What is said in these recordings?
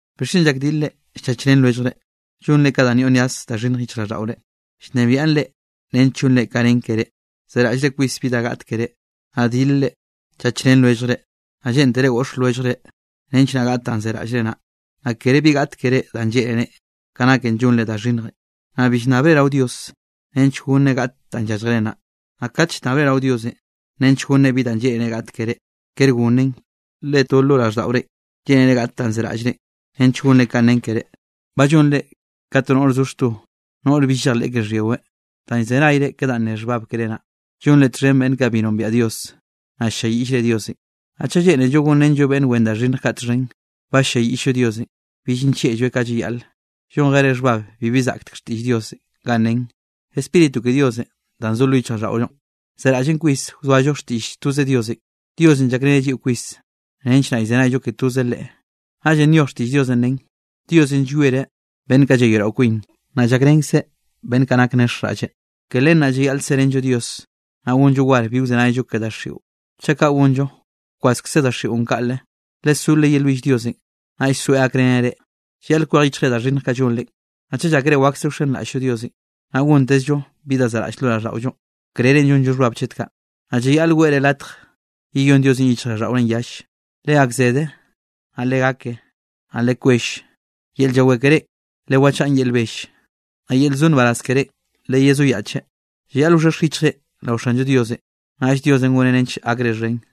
¿Bixchen llakdilre llchachrén lwelljre? Llonre kaꞌ danꞌ yoꞌ nyaz da xhinnjenꞌ yichjraꞌlldaꞌore, llnebiaꞌn reꞌ nench llonre ka nen keré. Zeraꞌllre kwis bi da gaꞌt keré, naꞌ dilre chachrén lwelljre, naꞌ lleꞌntere got lwelljre nench naꞌ gaꞌt danꞌ zeraꞌllre naꞌ. Naꞌ kere bi gaꞌt keré danꞌ lleꞌnerenꞌ, ka naken llonre da xhinnjenꞌ, naꞌ bi llnnabre rao Dios nench gonneꞌ gaꞌt danꞌ yálljere naꞌ. Naꞌ kate llnnabre rao Diosenꞌ nench gonneꞌ bi danꞌ lleꞌnere gaꞌt keré, kere gonneꞌn, le to lo raꞌlldaꞌorenꞌ lleꞌnere gaꞌt danꞌ zeraꞌllre, nench gonre ka nen keré. Ba llonre ka to noꞌr zo xto, noꞌr bill llejleꞌ ke xhyiweꞌ. Danꞌ llzenayre ke danꞌ ne xhbab keré naꞌ, llonre txhen beꞌnn kaꞌ bi nombiaꞌ Dios, naꞌ ll-lliayiꞌllre Diosenꞌ. Naꞌ chaꞌ lleꞌnello gonrenllo beꞌnn wen da xhinnj kaꞌ txhen, ba ll-lliayiꞌll-llo Diosenꞌ, bill nllieꞌlloeꞌ ka llayaꞌle. Llonjere xhbab bibi zaꞌk xtiꞌll Diosenꞌ ganꞌ nen: “Spíritu ke Diosenꞌ danꞌ zo lo yichjraꞌlldaꞌollonꞌ, zeraꞌllen kwis wzoallo xtiꞌll toze Diosenꞌ.” Diosenꞌ llakreneꞌ lliꞌo kwis, nench naꞌ llzenayllo ke toze Leꞌe. Naꞌllenꞌ nyoj xtiꞌll Diosenꞌ nen: “Diosenꞌ llwiereꞌ beꞌnn kaꞌ llayoeꞌrao kwin, naꞌ llakrenkzeꞌ beꞌnn kaꞌ nak nexjraꞌlleꞌ.” Ke len naꞌ llayaꞌl serenllo Dios, naꞌ gonllo war bi wzenayllo ke daxiꞌon. Chaꞌ kaꞌ gonllo, wkwaskze daxiꞌon kaꞌle. Lesó leyelwill Diosenꞌ, naꞌll soeꞌ gakreneꞌ reꞌ. Llayaꞌl kwej yichjre da xhinnj kaꞌ llonre. Naꞌ chaꞌ llákere wakse wxenraꞌll-llo Diosenꞌ, naꞌ gontezllo bi da zaꞌraꞌll lo raꞌlldaꞌollonꞌ, krerenꞌ llonre xhbabenꞌ chet kaꞌ, naꞌ llayaꞌl weꞌre latj yeyón Diosenꞌ yichjraꞌlldaꞌorenꞌ yalle. Legakzede, naꞌ legake, naꞌ lekwell. Yel llawé kerénꞌ lewachaꞌn yel bell, naꞌ yel zo nbaraz kerénꞌ leyezoyaꞌche. Llayaꞌl wxhexj yichjre rao Xanllo Diosenꞌ, naꞌll Diosenꞌ goneꞌ nench gakre xhen.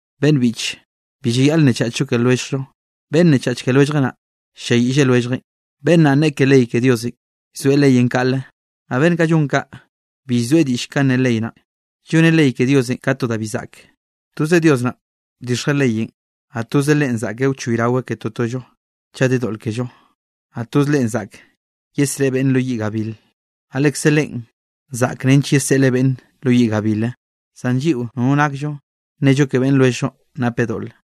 Beꞌnn biꞌche, bi llayaꞌl nnechachllo ke lwelljllo. Beꞌnn nnechach ke lwelljeꞌ naꞌ, ll-lliayiꞌlle lwelljeꞌn, beꞌnn naꞌn nneꞌe ke ley ke Dios, llzoeꞌ leyenꞌ kaꞌle. Naꞌ beꞌnn kaꞌ llon kaꞌ, bi llzoeꞌ diꞌll kanꞌ ne ley naꞌn. Lloneꞌ ley ke Diosenꞌ ka to da bi zaꞌke. Toze Dios naꞌn bdixjeꞌ leyenꞌ, naꞌ toze Leꞌen zaꞌke wchoyraweꞌ ke totollo chaꞌ de doꞌl kello. Naꞌ toz Leꞌe zaꞌk yesreꞌe beꞌnn lo yiꞌ gabil, naꞌ lekze Leꞌen zaꞌk nench yeseꞌleꞌ beꞌnn lo yiꞌ gabilenꞌ. Zan lliꞌo nono nakllo nnello ke beꞌnn lwelljllo napeꞌ doꞌle.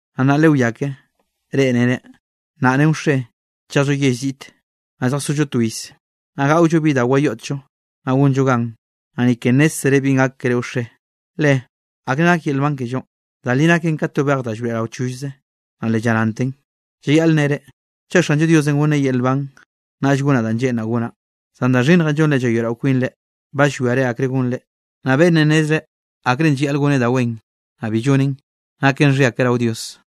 Naꞌ nnaꞌ lewiá ke, reꞌ nere: “Nnaꞌ ren wxe, chejllo yell ziꞌte, naꞌ lljasollo to iz, naꞌ gaꞌollo bi da wayoꞌtllo, naꞌ gonllo gan.” Naꞌ ni ke nnézzere binꞌ gak keré wxe. Le ¿akre nak yel nban kellonꞌ? Da li naken ka to bej da llroeꞌrao chollze, naꞌ le llaranten. Llayaꞌl nnere: “Chaꞌ Xanllo Diosenꞌ gonneꞌ yel nban, naꞌll gonaꞌ da lleꞌnraꞌ gonaꞌ.” Zan da xhinnjenꞌ llonre llayoeꞌrao kwinre, ba llwiare akre gonre. Naꞌ beꞌnnenꞌ nnezreꞌ akrenꞌ llayaꞌl goneꞌ da wen, naꞌ bi lloneꞌn, naken xhia keꞌe rao Dios.